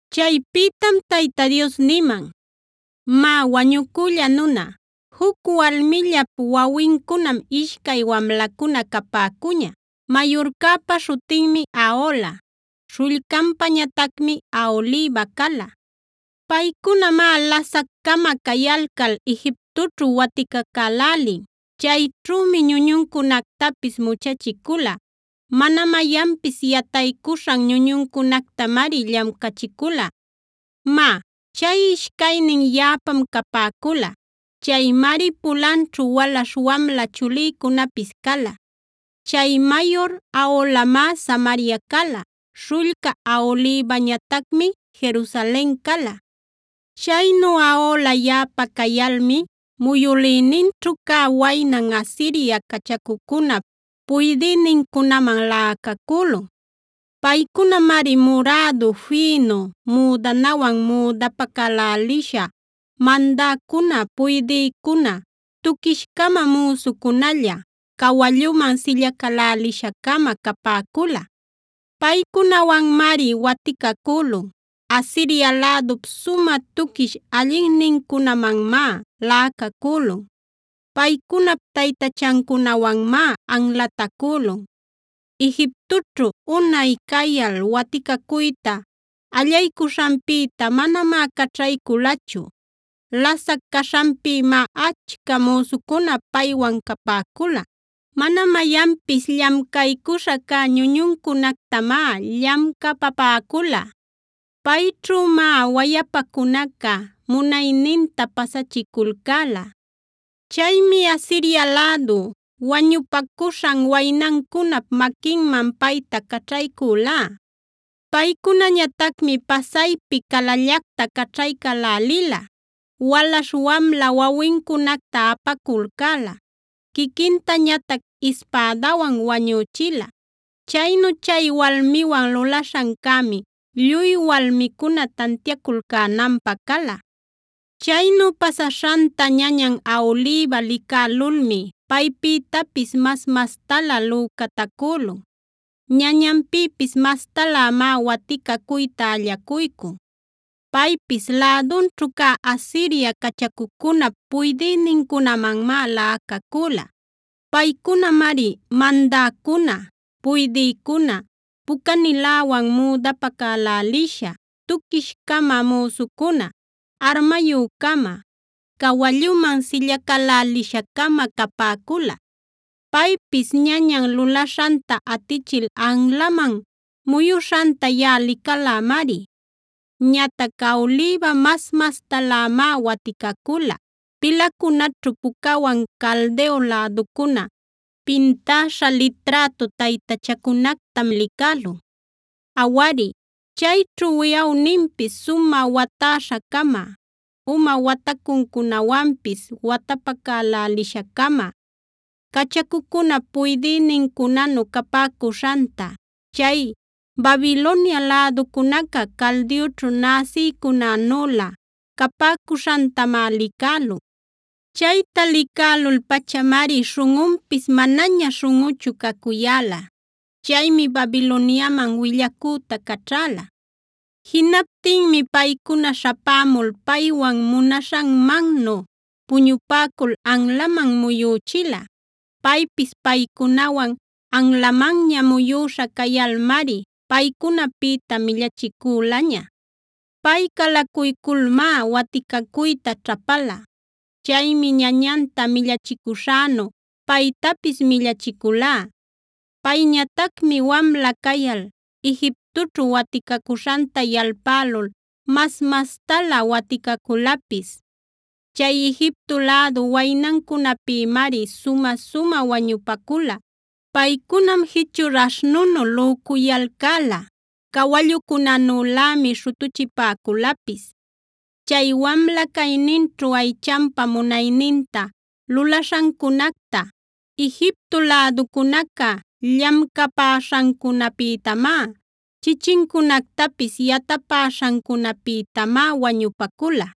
Chaypïtam Tayta Dios niman: “Má wañucülla nuna, juc walmillap wawincunam ishcay wamlacuna capäcuña. Mayurcäpa śhutinmi Ahola, śhullcanpañatacmi Aholiba cala. Paycunamá lasac-cama cayalcal Egiptoćhu waticacälälin. Chayćhümi ñuñuncunactapis muchachicula; mana mayanpis yataycuśhan ñuñuncunactamari llamcachicula. Má, chay ishcaynin yaꞌapam capäcula. Chaymari pulanćhu walaśh wamla chulïcunapis cala. Chay mayur Aholamá Samaria cala; śhullca Aholibañatacmi Jerusalen cala. “Chaynu Ahola yaꞌapa cayalmi muyülïninćhu cä waynan Asiria cachacucunap puydïnincunaman laꞌacacülun. Paycunamari murädu fïnu müdanawan müdapacälälisha, mandäcuna, puydïcuna, tuquish-cama müsucunalla, cawalluman sillacälälisha-cama capäcula. Paycunawanmari waticacülun; Asiria lädup sumä tuquish allinnincunamanmá laꞌacacülun. Paycunap taytachancunawanmá anlatacülun. Egiptoćhu unay cayal waticacuyta allaycuśhanpïta manamá caćhayculachu. Lasac caśhanpïmá achca müsucuna paywan capäcula. Mana mayanpis llamcaycuśha cä ñuñuncunactamá llamcapapäcula; payćhümá wayapacunaca munayninta pasachiculcäla. Chaymi Asiria lädu wañupacuśhan waynancunap maquinman payta caćhaycülá. Paycunañatacmi pasaypi calallacta caćhaycälälila; walaśh wamla wawincunacta apaculcäla, quiquintañatac ispädawan wañüchila. Chaynu chay walmiwan lulaśhancämi lluy walmicuna tantiaculcänanpä cala. “Chaynu pasaśhanta ñañan Aholiba licälulmi paypïtapis mas-mastalä lücatacülun. Ñañanpïpis mastalämá waticacuyta allacuycun. Paypis lädunćhu cä Asiria cachacucunap puydïnincunamanmá laꞌacacüla. Paycunamari mandäcuna, puydïcuna, pucaniläwan müdapacälälisha, tuquish-cama müsucuna, armayü-cama, cawalluman sillacälälisha-cama capäcula. Paypis ñañan lulaśhanta atichil anlaman muyuśhanta yaꞌa licalämari. Ñatac Aholiba mas-mastalämá waticacula. Pilacunaćhu pucawan Caldeo läducuna pintäśha liträtu taytachacunactam licälun. Awari, chayćhu wiꞌawninpis sumä watäśha-cama, uma watacuncunawanpis watapacälälisha-cama, cachacucunap puydïnincunanu capäcuśhanta, chay Babilonia läducunaca Caldeoćhu näsïcunanülä capäcuśhantamá licälun. Chayta licälul-pachamari śhunꞌunpis manaña śhunꞌuchu cacuyäla. Chaymi Babiloniaman willacüta caćhäla. Jinaptinmi paycuna śhapämul paywan munaśhanmannu puñupäcul anlaman muyüchila. Paypis paycunawan anlamanña muyüśha cayalmari paycunapïta millachicülaña. Pay calacuyculmá waticacuyta ćhapala. Chaymi ñañanta millachicuśhänu paytapis millachicülá. Payñatacmi wamla cayal Egiptoćhu waticacuśhanta yalpälul mas-mastalä waticaculapis. Chay Egipto lädu waynancunäpïmari sumä-sumä wañupacula. Paycunam jichur aśhnunu lücuyalcäla, cawallucunänülämi śhutuchipäculapis. Chay wamla cayninćhu aychanpa munayninta lulaśhancunacta, Egipto läducunaca llamcapäśhancunapïtamá, chichincunactapis yatapäśhancunapïtamá wañupacula.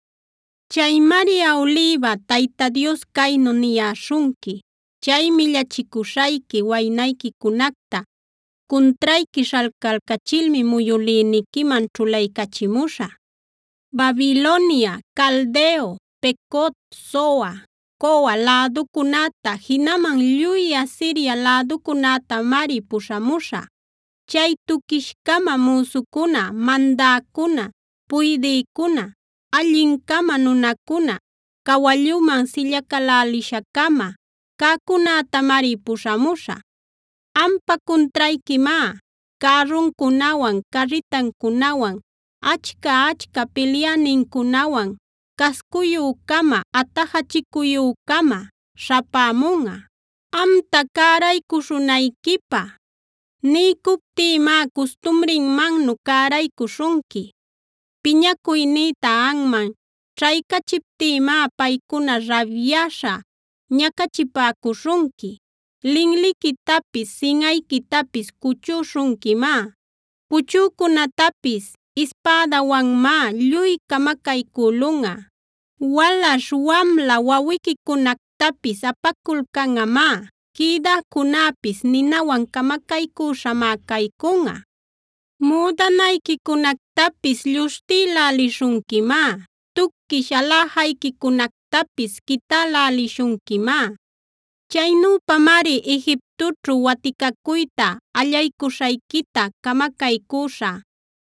“Chaymari Aholiba, Tayta Dios caynu niyäśhunqui: Chay millachicuśhayqui waynayquicunacta cuntrayqui śhalcalcachilmi muyülïniquiman ćhulaycachimuśhä. Babilonia, Caldeo, Pecod, Soa, Coa läducunäta jinaman lluy Asiria läducunätamari puśhamuśhä; chay tuquish-cama müsucuna, mandäcuna, puydïcuna, allin-cama nunacuna, cawalluman sillacälälisha-cama cäcunätamari puśhämuśhä. Ampa cuntrayquimá cärruncunawan, carritancunawan, achca-achca pilyänincunawan cascuyü-cama atajachicuyü-cama śhapämunꞌa. Amta cäraycuśhunayquipä niycuptïmá custumrinmannu cäraycuśhunqui. Piñacuynïta anman ćhaycachiptïmá paycuna rabyäśha ñacachipäcuśhunqui. Linliquitapis, sinꞌayquitapis cuchüśhunquimá. Puchücunätapis ispädawanmá lluy camacaycülunꞌa. Walaśh wamla wawiquicunactapis apaculcanꞌamá; quïdäcunäpis ninawan camacaycüśhamá caycunꞌa. Müdanayquicunactapis lluśhtïlälishunquimá; tuquish aläjayquicunactapis quitälälishunquimá. Chaynüpamari Egiptoćhu waticacuyta allaycuśhayquita camacaycüśhä.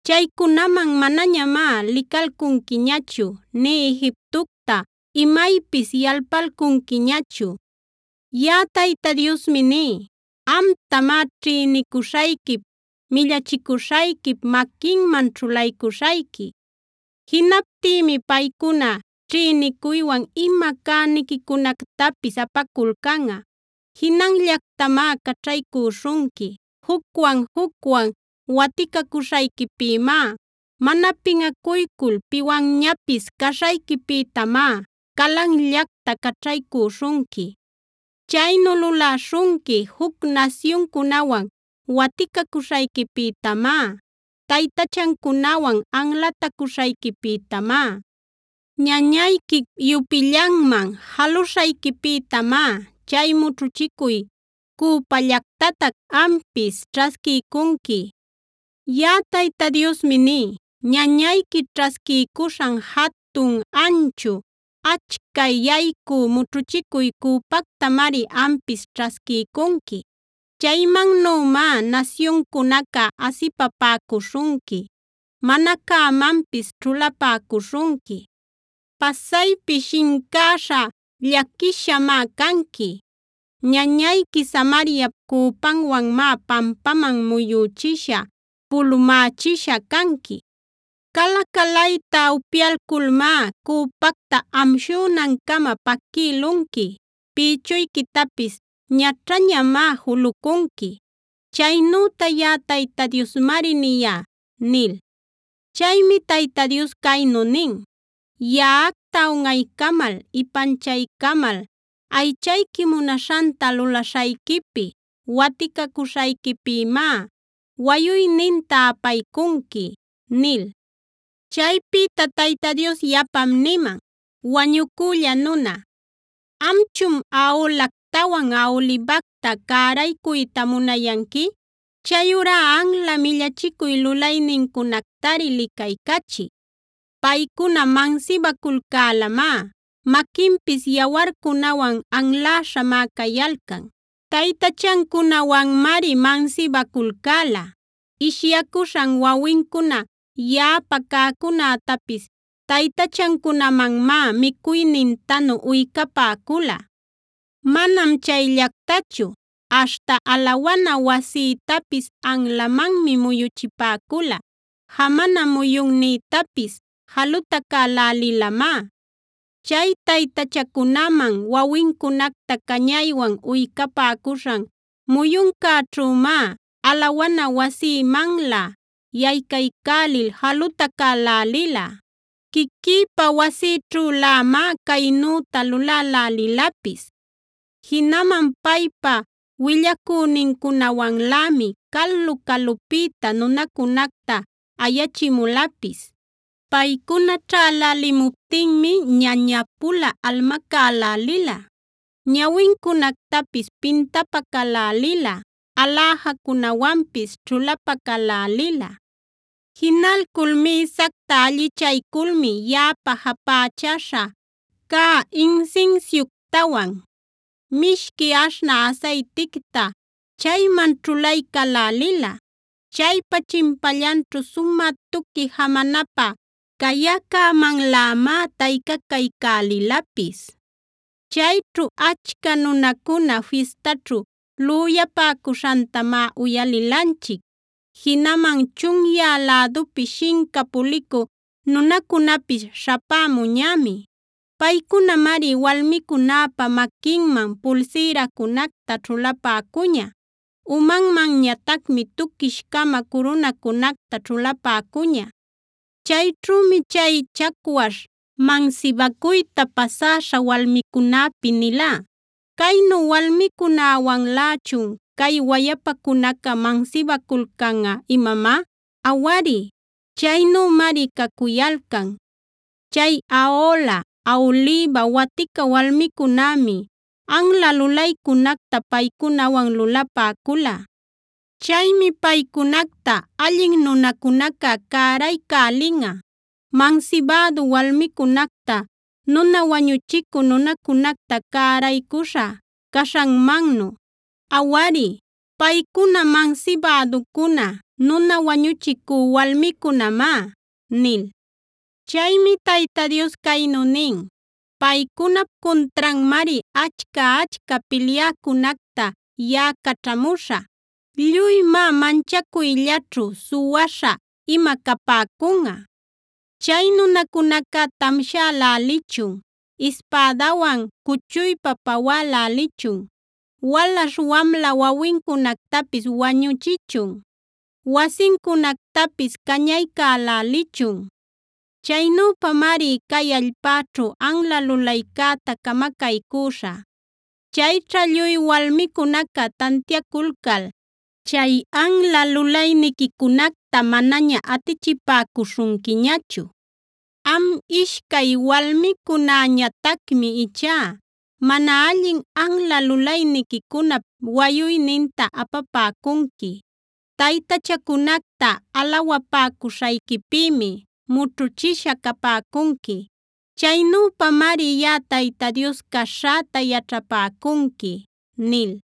Chaycunaman manañamá licalcunquiñachu nï Egiptocta imaypis yalpalcunquiñachu. “Yaꞌa Tayta Diosmi ní: Amtamá ćhïnicuśhayquip, millachicuśhayquip maquinman ćhulaycuśhayqui. Jinaptïmi paycuna ćhïnicuywan ima cäniquicunactapis apaculcanꞌa; jinanllactamá caćhaycüśhunqui. Jucwan-jucwan waticacuśhayquipïmá, mana pinꞌacuycul piwanñapis caśhayquipïtamá calanllacta caćhaycüśhunqui. Chaynu luläśhunqui juc nasyuncunawan waticacuśhayquipïtamá, taytachancunawan anlatacuśhayquipïtamá. Ñañayquip yupillanman jaluśhayquipïtamá chay mućhuchicuy cüpallactatac ampis ćhasquiycunqui. “Yaꞌa Tayta Diosmi ní: Ñañayqui ćhasquiycuśhan jatun, anchu, achca yaycü mućhuchicuy cüpactamari ampis ćhasquiycunqui. Chaymannümá nasyuncunaca asipapäcuśhunqui, mana cämanpis ćhulapäcuśhunqui. Pasaypi shincäśha, llaquishamá canqui. Ñañayqui Samariap cüpanwanmá pampaman muyüchisha, pulumächisha canqui. Cala-calayta upyayculmá, cüpacta amshünancama paquïlunqui; pïchuyquitapis ñaćhañamá julucunqui. Chaynüta yaꞌa Tayta Diosmari niyá” nil. Chaymi Tayta Dios caynu nin: “Yaꞌacta unꞌaycamal ipanchaycamal aychayqui munaśhanta lulaśhayquipi, waticacuśhayquipïmá wayuyninta apaycunqui” nil. Chaypïta Tayta Dios yapam niman: “Wañucülla nuna, ¿amchun Aholactawan Aholibacta cäraycuyta munayanqui? Chayurá anla millachicuy lulaynincunactari licaycachiy. Paycuna mansibaculcälamá; maquinpis yawarcunawan anläśhamá cayalcan. Taytachancunawanmari mansibaculcäla; ishyacuśhan wawincuna yaꞌapa cäcunätapis taytachancunamanmá micuynintanu uycapäcula. Manam chayllactachu, aśhta alawana wasïtapis anlamanmi muyuchipäcula; jamana muyunnïtapis jalutacälälilamá. Chay taytachacunaman wawincunacta cañaywan uycapäcuśhan muyuncäćhümá alawana wasïmanlä yaycaycälil jalutacälälila. Quiquïpa wasïćhülämá caynüta lulälälilapis. Jinaman paypa willacünincunawanlämi calu-calupïta nunacunacta ayachimulapis. Paycuna ćhälälimuptinmi ñaña-pula almacälälila, ñawincunactapis pintapacälälila, aläjacunawanpis ćhulapacälälila. Jinalcul mïsacta allichayculmi yaꞌapa japächäśha cä insinsiuctawan mishqui aśhnä asayticta chayman ćhulaycälälila. Chaypa chimpallanćhu sumä tuqui jamanapä cayäcämanlämá taycacaycälilapis. Chayćhu achca nunacuna fistaćhu lüyapäcuśhantamá uyalilanchic. Jinaman chunyä lädupi shinca pulicü nunacunapis śhapämuñämi. Paycunamari walmicunäpa maquinman pulsïracunacta ćhulapäcuña, umanmanñatacmi tuquish-cama curunacunacta ćhulapäcuña. “Chayćhümi chay chacwaśh mansibacuyta pasäśha walmicunäpi nilá: ‘¿Caynu walmicunawanlächun cay wayapacunaca mansibaculcanꞌa imamá? Awari, chaynümari cacuyalcan. Chay Ahola, Aholiba watica walmicunämi anla lulaycunacta paycunawan lulapäcula. Chaymi paycunacta allin nunacunaca cäraycälinꞌa, mansibädu walmicunacta, nuna wañuchicü nunacunacta cäraycuśha caśhanmannu. Awari, paycuna mansibäducuna, nuna wañuchicü walmicunamá’” nil. Chaymi Tayta Dios caynu nin: “Paycunap cuntranmari achca-achca pilyäcunacta yaꞌa caćhamuśhä; lluymá manchacuyllaćhu, suwaśha ima capäcunꞌa. Chay nunacunaca tamshälälichun, ispädawan cuchuypa pawälälichun. Walaśh wamla wawincunactapis wañüchichun, wasincunactapis cañaycälälichun. Chaynüpamari cay allpäćhu anla lulaycäta camacaycüśhä. Chayćha lluy walmicunaca tantiaculcal chay anla lulayniquicunacta manaña atichipäcuśhunquiñachu. Am ishcay walmicunäñatacmi ichá mana allin anla lulayniquicunap wayuyninta apapäcunqui. Taytachacunacta alawapäcuśhayquipïmi mućhuchisha capäcunqui. Chaynüpamari yaꞌa Tayta Dios caśhäta yaćhapäcunqui” nil.